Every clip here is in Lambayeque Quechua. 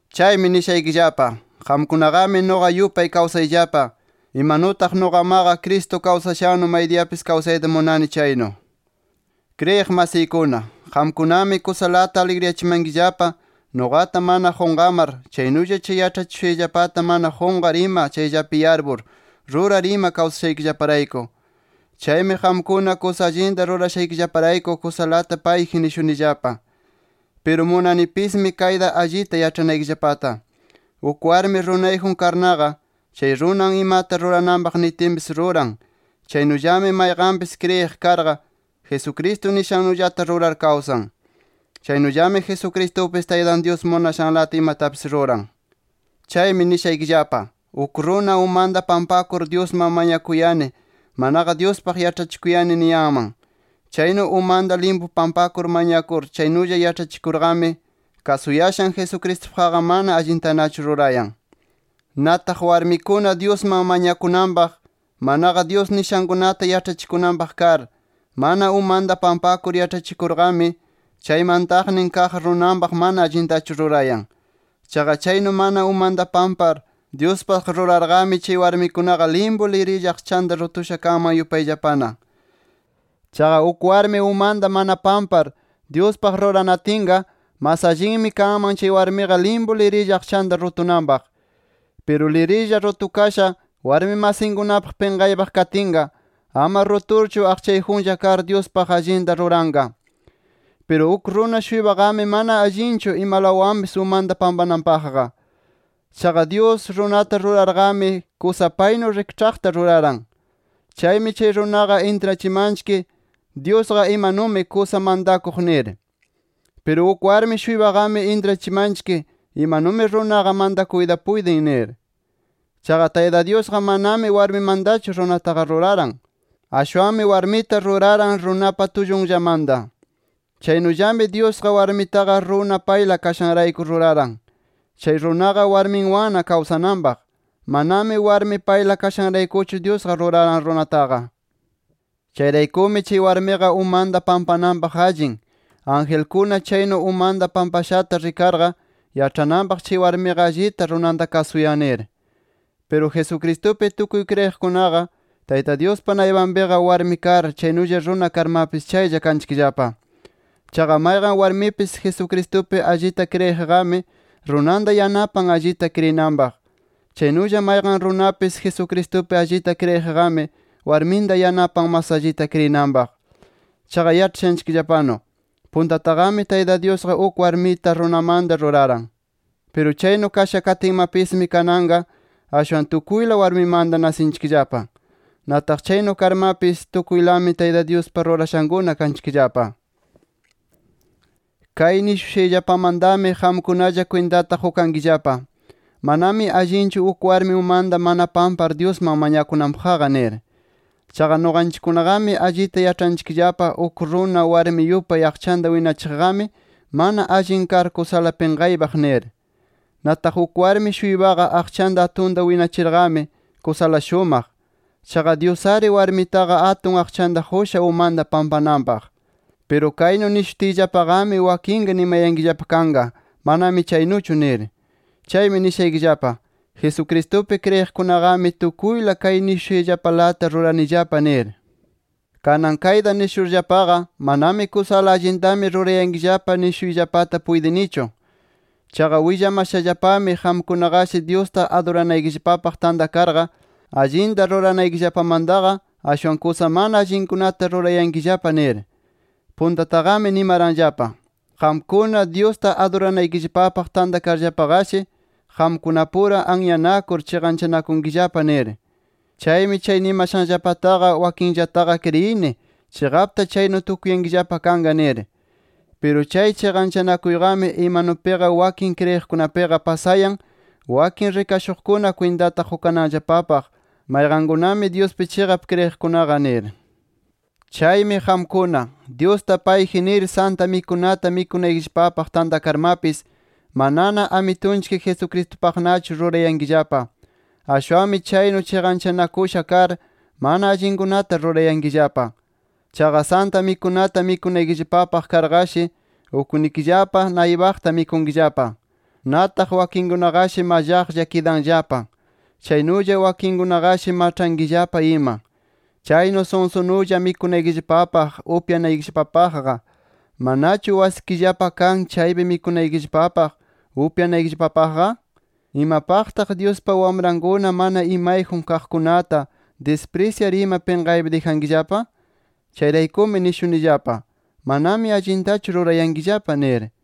Chaymi nishaykillapa: Qamkunaqami nuqa yupay kawsayllapa, imanutaq nuqamaqa Cristo kawsashannu maydiyapis kawsayta munani chaynu. Kriyiq masiykuna, qamkunami kusalata aligriyachimankillapa nuqata mana qunqamar, chaynulla chay yaĉhachishushayllapata mana qunqar ima chayllapi yarpur, rurar ima kawsashaykillaparayku. Chaymi qamkuna kusa allinta rurashaykillaparayku kusalata payji nishunillapa. Piru munanipismi kayta allita yaĉhanaykillapata. Uk warmi runayjun karnaqa, chay runan imata rurananpaq nitinpis ruran, chaynullami mayqanpis kriyiq karqa, Jesucristo nishannullata rurar kawsan. Chaynullami Jesucristupis Taytan Dyus munashanlata imatapis ruran. Chaymi nishaykillapa: Uk runa umanta pampakur, Dyusman mañakuyani, manaqa Dyuspaq yaĉhachikuyani niyanman. Chaynu umanta limpu pampakur mañakur, chaynulla yaĉhachikurqami, kasuyashan Jesucristupaqqa mana allintanachu rurayan. Nataq warmikuna, Dyusman mañakunanpaq, manaqa Dyus nishankunata yaĉhachikunanpaq kar, mana umanta pampakur yaĉhachikurqami, chay mantaqnin kaq runanpaq mana allintachu rurayan. Chaqa chaynu mana umanta pampar, Dyuspaq rurarqami, chay warmikunaqa limpu lirilla aqchanta rutusha kanman yupayllapana. Chaqa uk warmi umanta mana pampar, Dyuspaq ruranatinqa, mas allinmi kanman chay warmiqa limpu lirilla aqchanta rutunanpaq. Piru lirilla rutukasha, warmi masinkunapaq pinqaypaq katinqa, ama ruturchu aqchayjunlla kar, Dyuspaq allinta ruranqa. Piru uk runa-shuypaqami mana allinchu imalawanpis umanta pampananpaqqa. Chaqa Dyus, runata rurarqami kusa paynu rikĉhaqta ruraran. Chaymi chay runaqa intrachimanchik Dyusqa imanumi kusa mantakuq nir. Piru uk warmi-shuypaqami intrachimanchik, imanumi runaqa mantakuyta puytin nir. Chaqa Tayta Dyusqa manami warmimantachu ruraran runataqa. Ashwanmi warmita ruraran runapa tullunllamanta. Chaynullami Dyusqa, warmitaqa runa payla kashanrayku ruraran. Chay runaqa warmiwanna kawsananpaq. Manami warmi payla kashanraykuchu Dyusqa ruraran runataqa. Chayraykumi, chay warmiqa umanta pampananpaq allin, angelkuna chaynu umanta pampashata rikarqa, yaĉhananpaq chay warmiqa allita runanta kasuyan nir. Piru Jesucristupi tukuy kriyiqkunaqa Tayta Dyuspa naypanpiqa warmi kar, chaynulla runa karmapis chaylla kanchikllapa. Chaqa mayqan warmipis, Jesucristupi allita kriyiqqami, runanta yanapan allita kriyinanpaq. Chaynulla mayqan runapis, Jesucristupi allita kriyiqqami, warminta yanapan mas allita kriyinanpaq. Chaqa yaĉhashanchikllapanu, puntataqami Tayta Dyusqa uk warmita runamanta ruraran. Piru chaynu kasha katinmapismi, kananqa ashwan tukuyla warmimanta nasinchikllapa. Nataq chaynu karmapis, tukuylami Tayta Dyuspa rurashankuna kanchikllapa. Kay nishushayllapamantami qamkunalla kwintata qukankillapa: Manami allinchu uk warmi umanta mana pampar, Dyusman mañakunanpaqqa nir. Chaqa nuqanchikkunaqami allita yaĉhanchikllapa uk runa, warmi yupay aqchanta winachiqqami, mana allin kar kusala pinqaypaq nir. Nataq uk warmi-shuypaqa aqchanta atunta winachirqami, kusala shumaq. Chaqa Dyus-ari warmitaqa atun aqchanta qusha, umanta pampananpaq. Piru kaynu nishutiyllapaqami, wakinqa nimayankillapa kanqa, manami chaynuchu nir. Chaymi nishaykillapa: Jesucristupi kriyiqkunaqami, tukuyla kay nishushayllapalata ruranillapa nir. Kanan kayta nishurllapaqa, manami kusala allintami rurayankillapa nishuyllapata puytinichu. Chaqa willamashallapami qamkunaqashi Dyusta aduranaykillapapaq tantakarqa, allinta ruranaykillapamantaqa, ashwan kusa mana allinkunata rurayankillapa nir. Puntataqami nimaranllapa: Qamkuna, Dyusta aduranaykillapapaq tantakarllapaqashi, qamkunapura anyanakur chiqanchanakunkillapa nir. Chaymi chay nimashanllapataqa, wakinllataqa kriyini, chiqapta chaynu tukuyankillapa kanqa nir. ¡Piru chay chiqanchanakuyqami, imanupiqa wakin kriyiqkunapiqa pasayan, wakin rikashuqkuna kwintata qukananllapapaq mayqankunami, Dyuspi chiqap kriyiqkunaqa! nir. Chaymi qamkuna, Dyusta payji nir Santa Mikunata mikunaykillapapaq tantakarmapis, manana Amitunchik Jesucristupaqnachu rurayankillapa. Ashwanmi chaynu chiqanchanakusha kar, mana allinkunata rurayankillapa. Chaqa Santa Mikunata mikunaykillapapaq karqashi, uknikillapa naypaqta mikunkillapa. Nataq wakinkunaqashi mallaqlla kidanllapa, chaynulla wakinnikikunaqashi maĉhankillapa ima. Chaynu sunsunulla mikunaykillapapaq, upyanaykillapapaqqa, ¿manachu wasikillapa kan, chaypi mikunaykillapapaq, upyanaykillapapaqqa? ¿Imapaqtaq Dyuspa wamrankuna mana imayjun kaqkunata disprisyar ima pinqaypi dijankillapa? Chayraykumi nishunillapa: ¡Manami allintachu rurayankillapa! nir.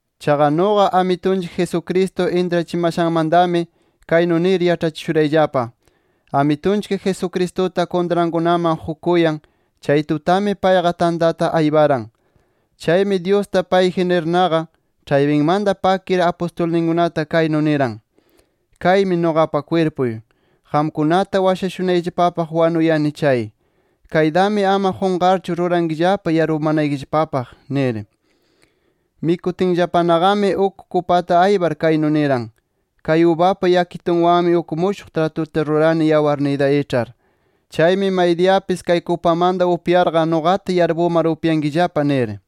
Chaqa nuqa, Amitunchik Jesucristo intrachimashanmantami, kaynu nir yaĉhachishurayllapa: Amitunchik Jesucristuta kuntrankunaman qukuyan, chay tutami payqa tantata ayparan. Chaymi Dyusta payji nirnaqa, ĉhaypinmanta pakir apustulninkunata kaynu niran: “Kaymi nuqapa kwirpuy. Qamkunata washashunayllapapaq wanuyani chay. Kaytami ama qunqarchu rurankillapa yarpumanaykillapapaq” nir. Mikutinllapanaqami, uk kupata aypar kaynu niran: “Kay ubapa yakitunwanmi uk mushuq tratuta rurani yawarniyta iĉhar. Chaymi maydiyapis kay kupamanta upyarqa nuqata yarpumar upyankillapa” nir.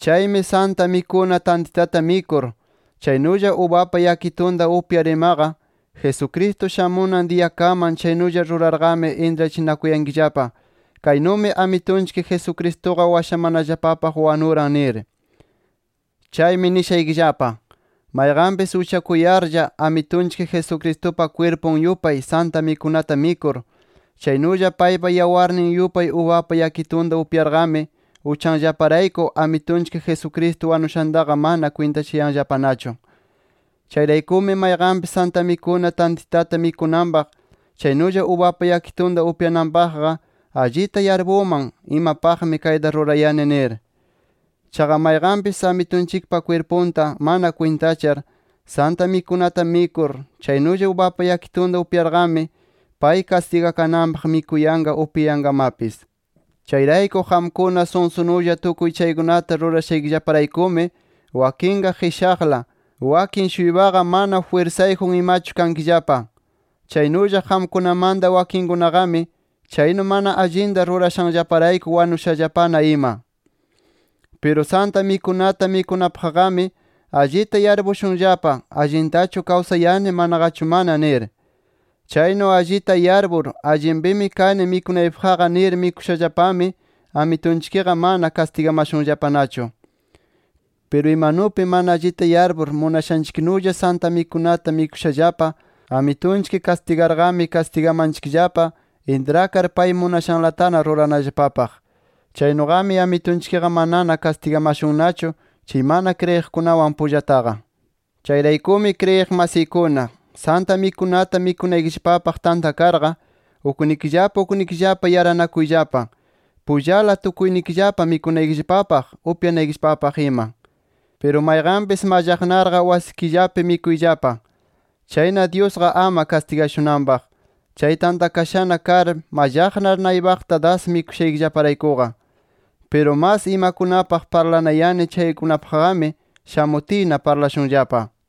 Chaymi Santa Mikuna tantitata mikur, chaynulla ubapa yakitunta upyar imaqa, Jesucristo shamunan diyakaman chaynulla rurarqami intrachinakuyankillapa: Kaynumi Amitunchik Jesucristuqa washamanallapapaq wanuran nir. Chaymi nishaykillapa: Mayqanpis uchakuyarlla, Amitunchik Jesucristupa kwirpun yupay Santa Mikunata mikur, chaynulla paypa yawarnin yupay ubapa yakitunta upyarqami, uchanllaparayku Amitunchik Jesucristo wanushantaqa mana kwintachayanllapanachu. Chayraykumi mayqanpis Santa Mikuna tantitata mikunanpaq, chaynulla ubapa yakitunta upyananpaqqa, allita yarpunman, imapaqmi kayta rurayani nir. Chaqa mayqanpis, Amitunchikpa kwirpunta mana kwintachar, Santa Mikunata mikur, chaynulla ubapa yakitunta upyarqami, pay kastigakananpaq mikuyanqa, upyayanqamapis. Chayrayku qamkuna sunsunulla tukuy chaykunata rurashaykillaparaykumi, wakinqa qishaqla, wakin-shuypaqa mana jwirsayjun imachu kankillapa. Chaynulla qamkunamanta wakinkunaqami chaynu mana allinta rurashanllaparayku wanushallapana ima. Piru Santa Mikunata mikunapaqqami allita yarpushunllapa allintachu kawsayani manaqachu mana nir. Chaynu allita yarpur, allinpimi kani mikunaypaqqa nir mikushallapami, Amitunchikqa mana kastigamashunllapanachu. Piru imanupi mana allita yarpur munashanchiknulla Santa Mikunata mikushallapa Amitunchik kastigarqami, kastigamanchikllapa intrakar pay munashanlatana ruranallapapaq. Chaynuqami Amitunchikqa manana kastigamashunnachu chay mana kriyiqkunawan pullataqa. Chayraykumi kriyiq masiykuna, Santa Mikunata mikunaykillapapaq tantakarqa, uknikillapa uknikillapa yaranakuyllapa. Pullala tukuynikillapa mikunaykillapapaq, upyanaykillapapaq ima. Piru mayqanpis mallaqnarqa wasikillapi mikuyllapa. Chayna Dyusqa ama kastigashunanpaq, chay tantakashana kar, mallaqnar naypaqta das mikushaykillaparaykuqa. Piru mas imakunapaq parlanayani chaykunapaqqami, shamutiyna parlashunllapa.